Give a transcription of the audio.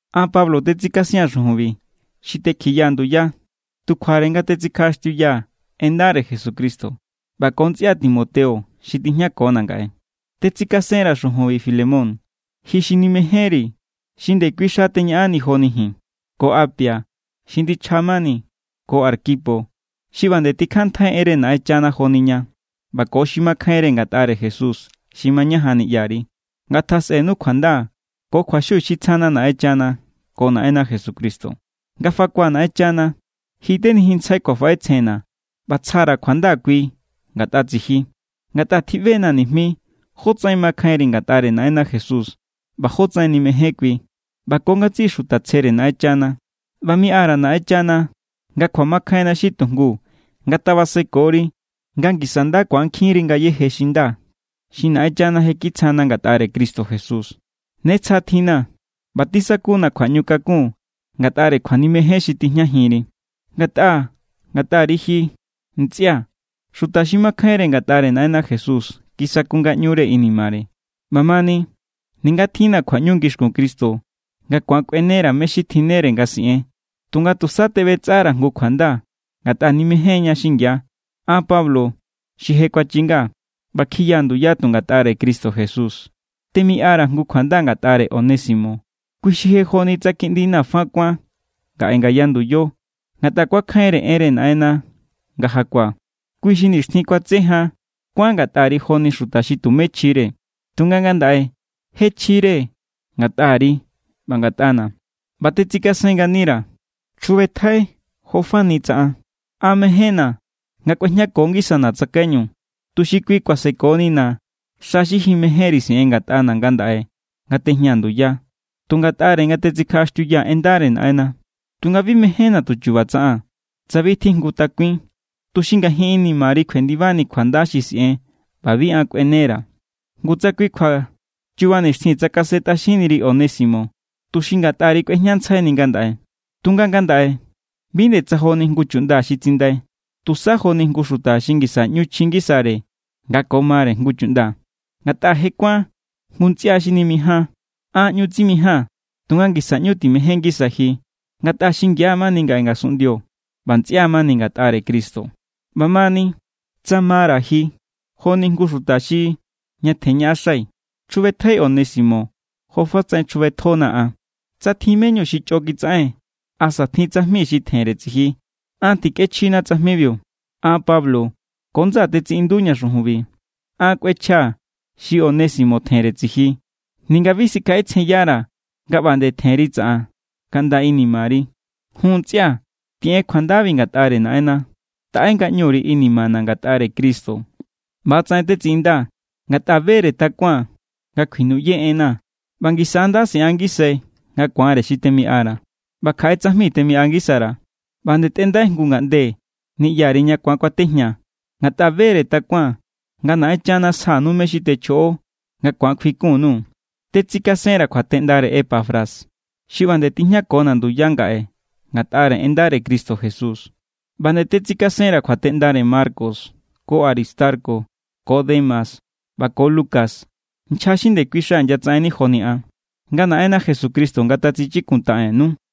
An, Pablo, tetsikasia̱n xujunbi, xi tekjiyaa̱ nduya tu kjuare nga tetsikjaꞌaxtiuyaa̱ en ndare Jesucristo, ꞌba ko ntsꞌia Timoteo xi tijñakona̱ ngaꞌe. Tetsikasenra̱ xujunbi Filemón, ji xi nimejénri̱ xi ndekui xa teñaꞌanni joni ji̱n, ko Apia xi ndichja mani, ko Arquipo xi ꞌba nde tikjanntjai enre Naꞌenchana joni ña, ꞌba ko xi makjainre ngatꞌare Jesús xi mañajan niꞌyari. Ngatasꞌenu kjuanda ko kjuaxiu xi tsjana Naꞌenchana ko Naꞌenna Jesucristo. Nga fakua̱ Naꞌenchana, ji tenijinntsjai kjuafaꞌetsjenna̱ ꞌba tsja_ra̱ kjuanda kui ngatꞌa tsiji. Ngatꞌa tjiꞌbe=na̱ nijmi jótsaꞌen makjainri ngatꞌare Naꞌenna Jesús ꞌba jótsaꞌen nimején kui ꞌba ko ngatsiꞌi xuta tsjere Naꞌenchana. ꞌBa miꞌa_ra̱ Naꞌenchana nga kjuamakjainna xi tujngu ngatabasekori nga ngisa nda ku̱ankjinri ngayéje xi nda xi Naꞌenchana je kitsjana ngatꞌare Cristo Jesús. Ne tsja tjinna̱ ꞌba tisaku=na̱ kjuaꞌñukakun ngatꞌare kjuanimejen xi tijñajinri. Ngatꞌa ngatꞌari ji, ntsꞌia̱, xuta xi makjainre ngatꞌare Naꞌenna Jesús kisaku ngaꞌñure inimare. ꞌBamani, ninga tjinna̱ kjuaꞌñu ngixkun Cristo nga ku̱an kꞌuenera̱ mé= xi tjinnere nga siꞌen, tunga tusa teꞌbetsꞌara̱ jngu kjuanda ngatꞌa nimején=ña xingia. An Pablo xi je kuachingaa̱ ꞌba kjiyaa̱ nduya tu ngatꞌare Cristo Jesús, temiꞌara̱ jngu kjuanda ngatꞌare Onésimo. Kui xi je joni tsa kiꞌndina̱ fa kuán ngaꞌe ngaya nduyo ngatꞌa kuakjainre enre Naꞌenna nga jakuaa̱. Kui xi nixtjin kuatse jan kuán ngatꞌari joni xuta xi tumé chjire, tunga ngandaꞌe je chjire ngatꞌari ꞌba ngatꞌana̱. ꞌBa tetsikasen nganira̱. Chjubetjai jo fani tsa an. An mejénna̱ nga kꞌuejñako ngisana̱ tsakaiñu, tuxi kui kuasekonina̱ xa xi ji mejénri siꞌen ngatꞌana̱ ngandaꞌe nga tejñaa̱ nduya tu ngatꞌare nga tetsikjaꞌaxtiuyaa̱ en ndare Naꞌenna. Tunga bi mejénna̱ tu chu̱ba̱ tsaꞌaa̱n, tsa bi tjijngu takuin, tuxi ngajin inimari kjuendibani kjuanda xi siꞌen ꞌba bi an kꞌuenera̱. Ngu tsa kui= kjua chuba nixtjin tsakasentꞌaxinniri Onésimo, tuxi ngatꞌari kꞌuejñantsjaini ngandaꞌe. Tunga ngandaꞌe bi nde tsa joni jngu chuꞌnda xi tsindai. Tusa joni jngu xuta xi ngisa ꞌñu chji ngisare nga ko mare jngu chuꞌnda. Ngatꞌa je kuán jngu ntsꞌia xi nimijáan. An ꞌñu tsimijaa̱n, tunga ngisa ꞌñu timején ngisai ji. Ngatꞌa xingia mani ngaꞌe ngasunꞌndio ꞌba ntsꞌia mani ngatꞌare Cristo. ꞌBamani, tsa mara̱ ji joni jngu xuta xi ñatjen ñaꞌaxai, chjubetjai Onésimo jofatsaꞌen chjubetjonaa̱ an. Tsa tjin me=ñu xi chꞌo kitsaꞌen asa tjin tsajmi xi tjenre tsiji, an tikꞌechjina tsajmibiu. An Pablo ko ndsaa̱ tetsiꞌinduña̱ xujunbi. An kꞌuechjaa̱ xi Onésimo tjenre tsiji, ninga bi sikjaꞌetsjenyara̱ nga ꞌba nde tjenri tsaꞌan kaꞌnda inimari. Jun ntsꞌia̱, tiꞌen kjuandabi ngatꞌare Naꞌenna. Taꞌe ngaꞌñuri inimana̱ ngatꞌare Cristo. ꞌBa=tsaꞌen tetsiꞌindaa̱, ngatꞌa bere takuaa̱n nga kjuinuꞌye enna̱ ꞌba ngisa= nda siꞌan ngisai nga ku̱anre xi temiꞌara̱. ꞌBa kjaꞌe tsajmi temiꞌa ngisara̱. ꞌBa nde tꞌendai jngu ngaꞌnde niꞌyari ña ku̱an kuatejñaa̱, ngatꞌa bere takuaa̱n nga Naꞌenchana sjanu mé= xi techjoꞌo, nga ku̱an kjuikun_nuu̱. Tetsikasenra̱ kjuateꞌndare Epafras, xi ꞌba nde tijñakona̱ nduya ngaꞌe ngatꞌare en ndare Cristo Jesús. ꞌBa nde tetsikasenra̱ kjuateꞌndare Marcos ko Aristarco ko Demas ꞌba ko Lucas, nchja xi ndekui xa inyatsaꞌenni joni an. Nga Naꞌenna Jesucristo ngatatsichikuntaꞌennu.